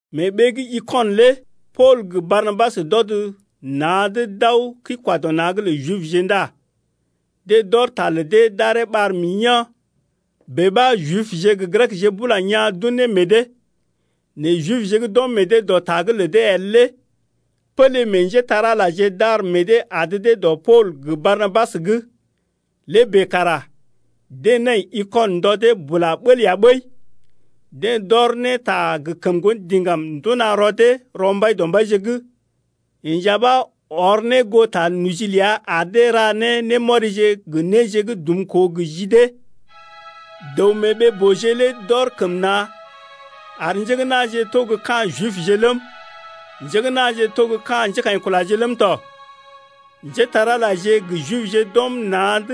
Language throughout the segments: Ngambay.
Mee ɓee gə́ Ikɔnə lé Pool gə Barnabas d’ɔd na̰’d d’aw kəi-kwa-dɔ-na̰’g lə Jibje ndá deḛ d’ɔr ta lə dee d’aree ɓar mḭ yaa̰, bèe ɓa Jibje gə Grekje bula yaa̰ d’un ne meḛ dee. Nɛ Jibje gə́ d’ɔm meḛ dee dɔ ta’g lə dee el lé pélé meḛ njépole-magəje d’ar meḛ dee adə dee dɔ Pool gə Barnabas’g. Lé bèe kara deḛ nai Ikɔnə ndɔ dee bula bəl ya ɓəi. Deḛ d’ɔr ne ta gə kəm ŋgondiŋgam nduna rɔ dee rɔ Mbaidɔmbaije’g. Yeḛ nja ɓa ɔr ne goo ta noji’g ləa ar dee ra ne némɔrije gə néje gə́ dumkoo gə ji dee. Dəw-mee-ɓee-booje lé d’ɔr kəm na̰ ar njé gə́ na̰je to gə́ ka̰ Jibje ləm, njé gə́ na̰je to gə́ ka̰ njékaḭkulaje ləm tɔ. Njétar-Alaje gə Jibje d’ɔm na̰’d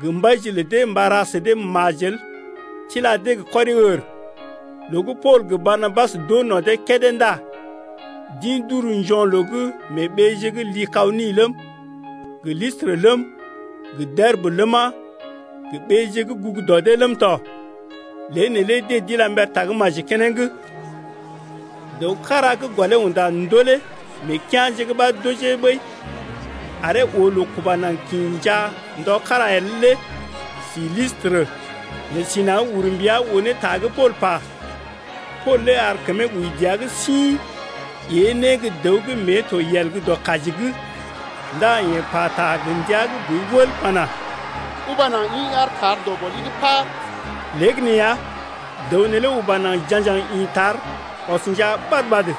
gə mbaije lə dee mba ra sə dee majel tila dee gə kɔri-ər. Loo gə́ Pool gə Barnabas d’oo no̰ dee kédé ndá d’ḭ d’uru njo̰loo’g mee ɓeeje gə́ Likaoni ləm, gə Listrə ləm, gə Derbə ləma, gə ɓeeje gə́ gugu dɔ dee ləm tɔ. Lée neelé deḛ d’ila mber tagə́maji keneŋ. Dəw kára gə́ gɔlee unda ndolé mee kea̰je’g ɓa d’ojee ɓəi aree oo loo kuba naŋg kḭ njaa ndɔ kára el lé si Listrə. Yeḛ si naŋg ur mbia oo ne ta gə́ Pool pa. Pool lé ar kəmee wəi dəa’g sḭ ée ne gə́ dəw gə́ mée to yel gə́ dɔ kaji’g, ndá yeḛ pata gə ndia gə́ boi wəl pana: Uba naŋg ḭ aar tar dɔ gɔli’g paar. Léegəneeya dəw neelé uba naŋg ja̰gjaŋ ḭ tar ɔs njaa ɓad-ɓad.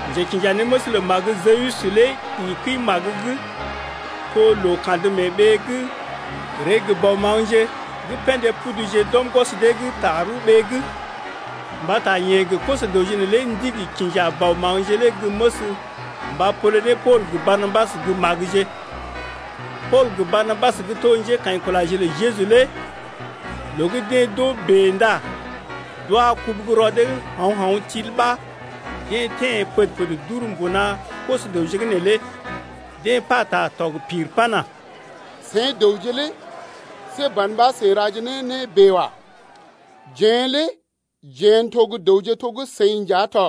Njekinjanéməs lə magə Jəwus lé ḭ kəi-magə gə́ to loo kandə mee ɓee’g ree gə bɔ maŋgje gə́ pḛdé puduje d’ɔm gwɔs dee’g tarəwɓee’g, mbata yeḛ gə koso-dəwje neelé ndigi kinja bɔ maŋgje lé gə́ məs mba pole ne Pool gə Barnabas gə́ magəje. Pool gə Barnabas gə́ to njékaḭkulaje lə Jeju lé loo gə́ deḛ d’oo bèe ndá d’wa kubu gə́ rɔ dee’g hao̰-hao̰ til ɓa deḛ teḛ pəd-pəd d’uru mbuna koso-dəwje’g neelé. Deḛ pata tɔg pir pana: Seḭ dəwje lé see ban ɓa seḭ raje ne né bèe wa. Jeḛ lé jeḛ n’to gə́ dəwje to gə́ seḭ nja tɔ.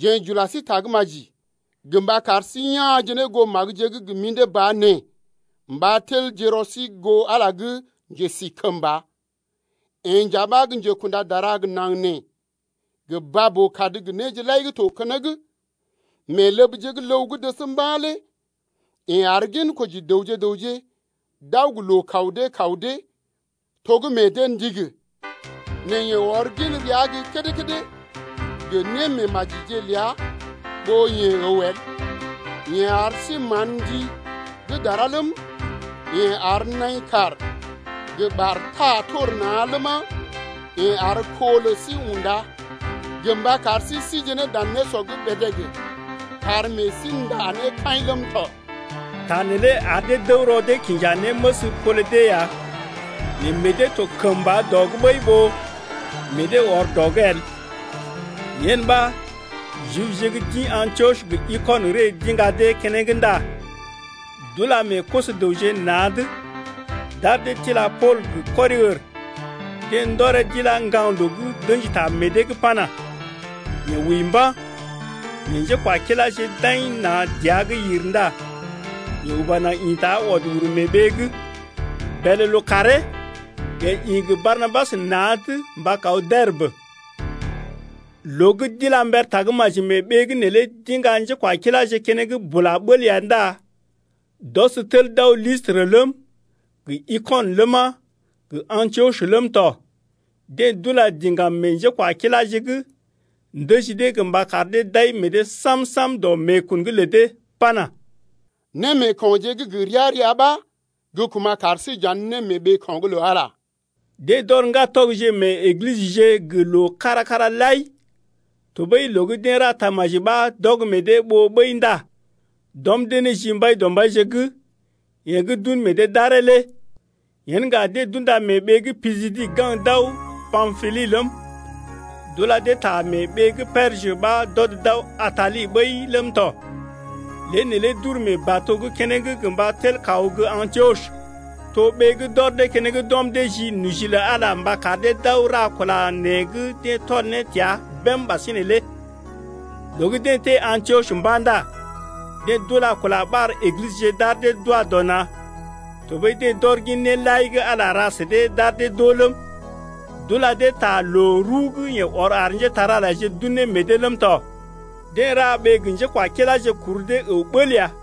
Jeḛ j’ula sí tagə́maji gə mba kar sí ya̰je ne goo magəje gə́ gə mḭdé ba nee mba telje rɔ sí goo Ala gə́ njesikəmba’g lé. Yeḛ nja ɓa gə́ njekunda dara gə naŋg nee gə baa-boo-kad gə néje lai gə́ to keneŋ. Mee ləbje gə́ ləw gə́ dəs mba̰ lé yeḛ ar ginkoji dəwje gə raŋg d’aw gə loo kaw dee kaw dee to gə́ meḛ dee ndigi. Nɛ yeḛ ɔr gin rəa gə́ kédé-kédé gə némeemajije ləa ɓó yeḛ əw el. Yeḛ ar sí mán ndi gə́ dara ləm, yeḛ ar naḭ kàr gə ɓar taa tor na̰ ləma, yeḛ ar kó lə sí unda gə mba kar sí síje ne dan nésɔ’g bèdèg kar meḛ sí ndá ne kaḭ ləm tɔ. Ta neelé ar dee d’əw rɔ dee kinja néməs pole dee ya nɛ meḛ dee to kəmba dɔ’g ɓəi ɓó meḛ dee ɔr dɔ’g el. Yen ɓa Jibje gə́ d’ḭ Antiɔs gə Ikɔnə ree d’iŋga dee keneŋ ndá d’ula meḛ koso-dəwje na̰’d, d’ar dee tila Pool gə kɔri-ər, deḛ ndɔree d’ilá ŋgaŋloo’g d’ə̰ji ta meḛ dee’g pana: Yeḛ wəi mba̰. Nɛ njékwakiláje d’aḭ na̰ dəa’g yir ndá yeḛ uba naŋg ḭta ɔd uru mee ɓee’g. Bèlè lookàree yeḛ ḭ gə Barnabas na̰’d mba kaw Derbə. Loo gə́ d’ila mber tagə́maji mee ɓee’g neelé d’iŋga njékwakiláje keneŋ bula bəl ya ndá d’ɔs tel d’aw Listrə ləm, gə Ikɔnə ləma, gə Antiɔs ləm tɔ. Deḛ d’ula diŋgam meḛ njékwakiláje’g ndəji dee gə mba kar dee d’ai meḛ dee sam-sam dɔ meekun’g lə dee pana: Némeeko̰je gə́ gə ria-ria ɓa gə́ kuma̰ kar sí j’andə ne mee ɓeeko̰’g lə Ala lé. Deḛ d’ɔr ŋgatɔgje mee Eglisəje gə loo kára-kára lai tɔɓəi loo gə́ deḛ ra tamaji ɓa d’ɔg meḛ dee ɓoo ɓəi ndá d’ɔm dee ne ji Mbaidɔmbaije’g yeḛ gə́ d’un meḛ dee d’aree lé. Yen ŋga deḛ d’unda mee ɓee gə́ Pisidi gaŋg d’aw Pampili ləm, d’ula dee ta mee ɓee gə́ Perjə ɓa d’ɔd d’aw Atali ɓəi ləm tɔ. Lée neelé d’uru mee bato’g keneŋ gə mba tel kaw gə́ Antiɔs. To ɓee gə́ d’ɔr dee keneŋ d’ɔm dee ji noji lə Ala’g mba kar dee d’aw ra kula nee gə́ deḛ tɔl ne təa bém ɓasinè lé. Loo gə́ deḛ teḛ Antiɔs mba̰ ndá deḛ d’ula kula ɓar Eglisəje d’ar dee d’wa dɔ na̰, tɔɓəi deḛ d’ɔr gin néje lai gə́ Ala ra sə dee d’ar dee d’oo ləm, d’ula dee ta loo rəw gə́ yeḛ ɔr ar njépole-magəje d’un ne meḛ dee ləm tɔ. Deḛ ra ɓee gə njékwakiláje kur dee əw bəl ya.